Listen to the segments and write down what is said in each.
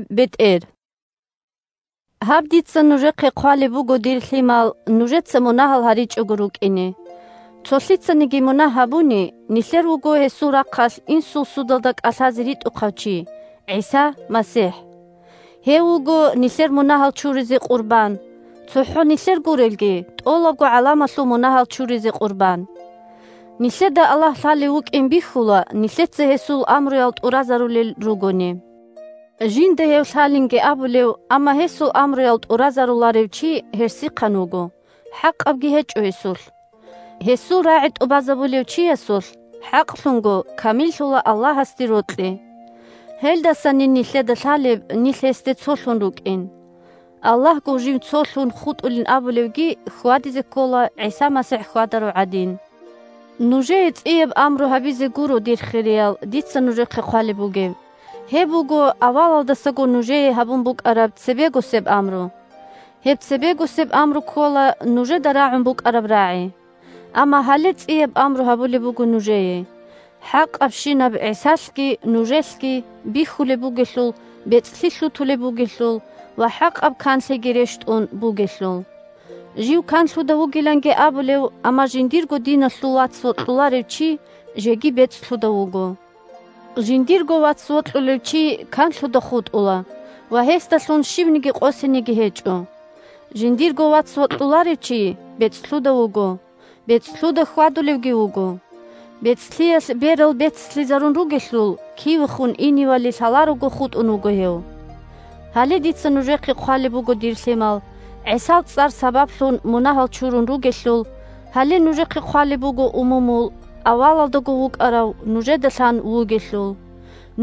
бетӀер 1Гьаб дица нужехъе хъвалеб буго, дир лъимал, нужеца мунагьал гьаричӀого рукӀине. Цо лъицаниги мунагь гьабуни, нилъер вуго гьесул рахъалъ Инсул судалда кӀалъазе ритӀухъав чи – ГӀиса МасихӀ. 2Гьев вуго нилъер мунагьал чуризе къурбан, цохӀо нилъер гурелги, тӀолабго гӀаламалъул мунагьал чуризе къурбан. Нилъеда Аллагь лъалев вукӀин бихьула нилъеца гьесул амруял тӀуразарулел ругони. Жинда гьев лъалинги абулев, амма гьесул амруял тӀуразаруларев чи гьерсихъан вуго, хӀакъабги гьечӀо гьесулъ. Гьесул рагӀи тӀубазабулев чиясулъ хӀакълъунго камиллъула Аллагьасде рокьи. Гьелдасанин нилъеда лъалеб нилъ гьесде цолъун рукӀин. Аллагьгун жив цолъун хутӀулин абулевги хьвадизе ккола ГӀиса МасихӀ хьвадарав гӀадин. Нужее цӀияб амру гьабизе гуро, дир хириял, дица нужехъе хъвалеб бугеб. Гьеб буго авалалдаго нужее гьабун букӀараб цебегосеб амру. Гьеб цебегосеб амру ккола нужеда рагӀун букӀараб рагӀи. Амма гьале цӀияб амру гьабулеб буго нужее – хӀакъабщинаб ГӀисалъги нужелъги бихьулеб бугелъул, бецӀлъи лъутулеб бугелъул ва хӀакъаб канлъиги рещтӀун бугелъул. Жив канлъуда вугиланги абулев, амма жиндирго диналъул вац вокьуларев чи жеги бецӀлъуда вуго. Жиндирго вац вокьулев чи канлъуда хутӀула ва гьесдалъун щивниги къосинеги гьечӀо. Жиндирго вац вокьуларев чи бецӀлъуда вуго, бецӀлъуда хьвадулевги вуго. БецӀлъиялъ берал бецлъизарун ругелъул, кивехун иневали лъаларого хутӀун вуго гьев. Гьале дица нужехъе хъвалеб буго, дир лъимал, ГӀисал цӀар сабаблъун мунагьал чурун ругелъул. Гьале нужехъе хъвалеб буго, умумул, авалалдаго вукӀарав нужеда лъан вугелъул.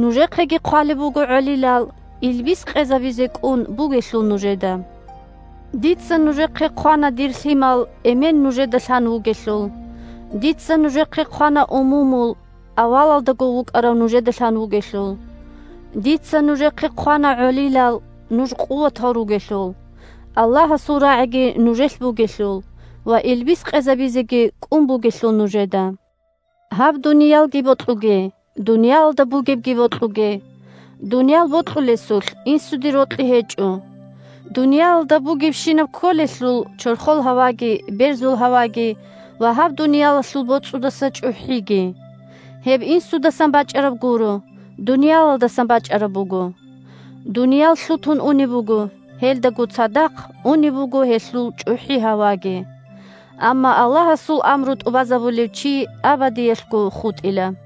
Нужехъеги хъвалеб буго, гӀолилал, илбис къезабизе кӀун бугелъул нужеда. Дица нужехъе хъвана, дир лъимал, Эмен нужеда лъан вугелъул. Дица нужехъе хъвана, умумул, авалалдаго вукӀарав нужеда лъан вугелъул. Дица нужехъе хъвана, гӀолилал, нуж къуватал ругелъул, Аллагьасул рагӀиги нужелъ бугелъул ва илбис къезабизеги кӀун бугелъул нужеда. Гьаб дуниялги бокьуге, дуниялалда бугебги бокьуге. Дуниял бокьулесулъ Инсуде рокьи гьечӀо. Дуниялалда бугебщинаб кколелъул чорхол гьаваги, берзул гьаваги ва гьаб дуниялалъул боцӀудаса чӀухӀиги. Гьеб Инсудасан бачӀараб гуро, дуниялалдасан бачӀараб буго. Дуниял лъутун унеб буго, гьелдаго цадахъ унеб буго гьелъул чӀухӀи-гьаваги. Амма Аллагьасул амру тӀубазабулев чи абадиялъго хутӀила.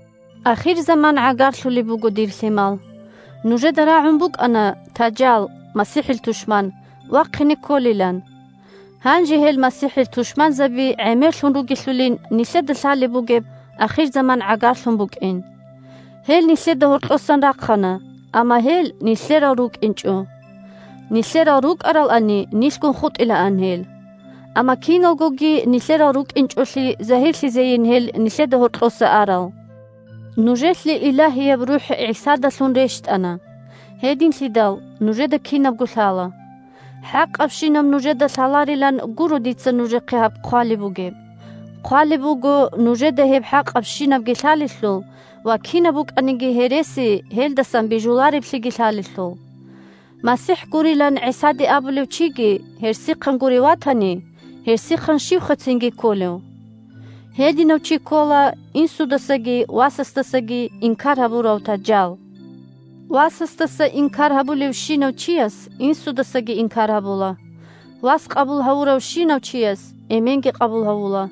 Ахирзаман гӀагарлъулеб буго, дир лъимал. Нужеда рагӀун букӀана Тажал (МасихӀил тушман) вахъине кколилан. Гьанже гьел МасихӀил тушманзаби гӀемерлъун ругелъулин нилъеда лъалеб бугеб ахирзаман гӀагарлъун букӀин. Гьел нилъеда гьоркьосан рахъана, амма гьел нилъерал рукӀинчӀо. Нилъерал рукӀаралани, нилъгун хутӀилаан гьел. Амма киналгоги нилъерал рукӀинчӀолъи загьирлъизейин гьел нилъеда гьоркьоса арал. Нужелъе Илагьияб РухӀ ГӀисадалъун рещтӀана, гьединлъидал нужеда кинабго лъала. ХӀакъабщинаб нужеда лъаларилан гуро дица нужехъе гьаб хъвалеб бугеб, хъвалеб буго нужеда гьеб хӀакъабщинабги лъалелъул ва кинаб букӀаниги гьереси гьелдасан бижулареблъиги лъалелъул. МасихӀ гурилан ГӀисаде абулев чиги гьерсихъан гурев ватани, гьерсихъан щивха цинги кколев? Гьединав чи ккола Инсудасаги Васасдасаги инкар гьабурав Тажал. Васасдаса инкар гьабулевщинав чияс Инсудасаги инкар гьабула. Вас къабул гьавуравщинав чияс Эменги къабул гьавула.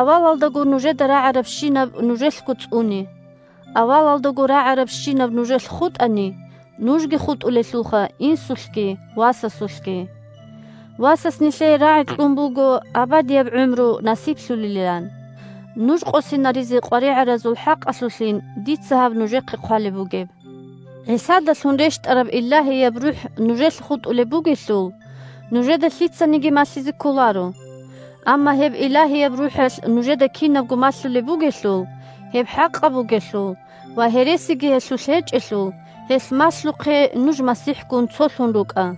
Авалалдаго нужеда рагӀарабщинаб нужелъго цӀуне. Авалалдаго рагӀарабщинаб нужелъ хутӀани, нужги хутӀулелха Инсулъги Васасулъги. Васас нилъее рагӀи кьун буго абадияб гӀумру насиблъулилан! Нуж къосинаризе къваригӀаразул хӀакъалъулъин дица гьаб нужехъе хъвалеб бугеб. ГӀисадалъун рещтӀараб Илагьияб РухӀ нужелъ хутӀулеб бугелъул, нужеда лъицаниги малъизе кколаро. Амма гьеб Илагьияб РухӀалъ нужеда кинабго малъулеб бугелъул, гьеб хӀакъаб бугелъул ва гьересиги гьелъулъ гьечӀелъул, гьелъ малъухъе нуж МасихӀгун цолъун рукӀа.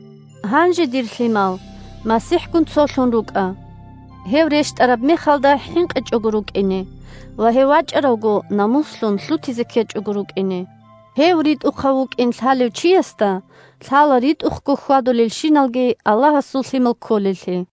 Гьанже, дир лъимал, МасихӀгун цолъун рукӀа, гьев рещтӀараб мехалда хӀинкъичӀого рукӀине ва гьев вачӀаравго намуслъун лъутизе ккечӀого рукӀине. Гьев ритӀухъав вукӀин лъалев чиясда лъала ритӀухъго хьвадулелщиналги Аллагьасул лъимал кколеллъи.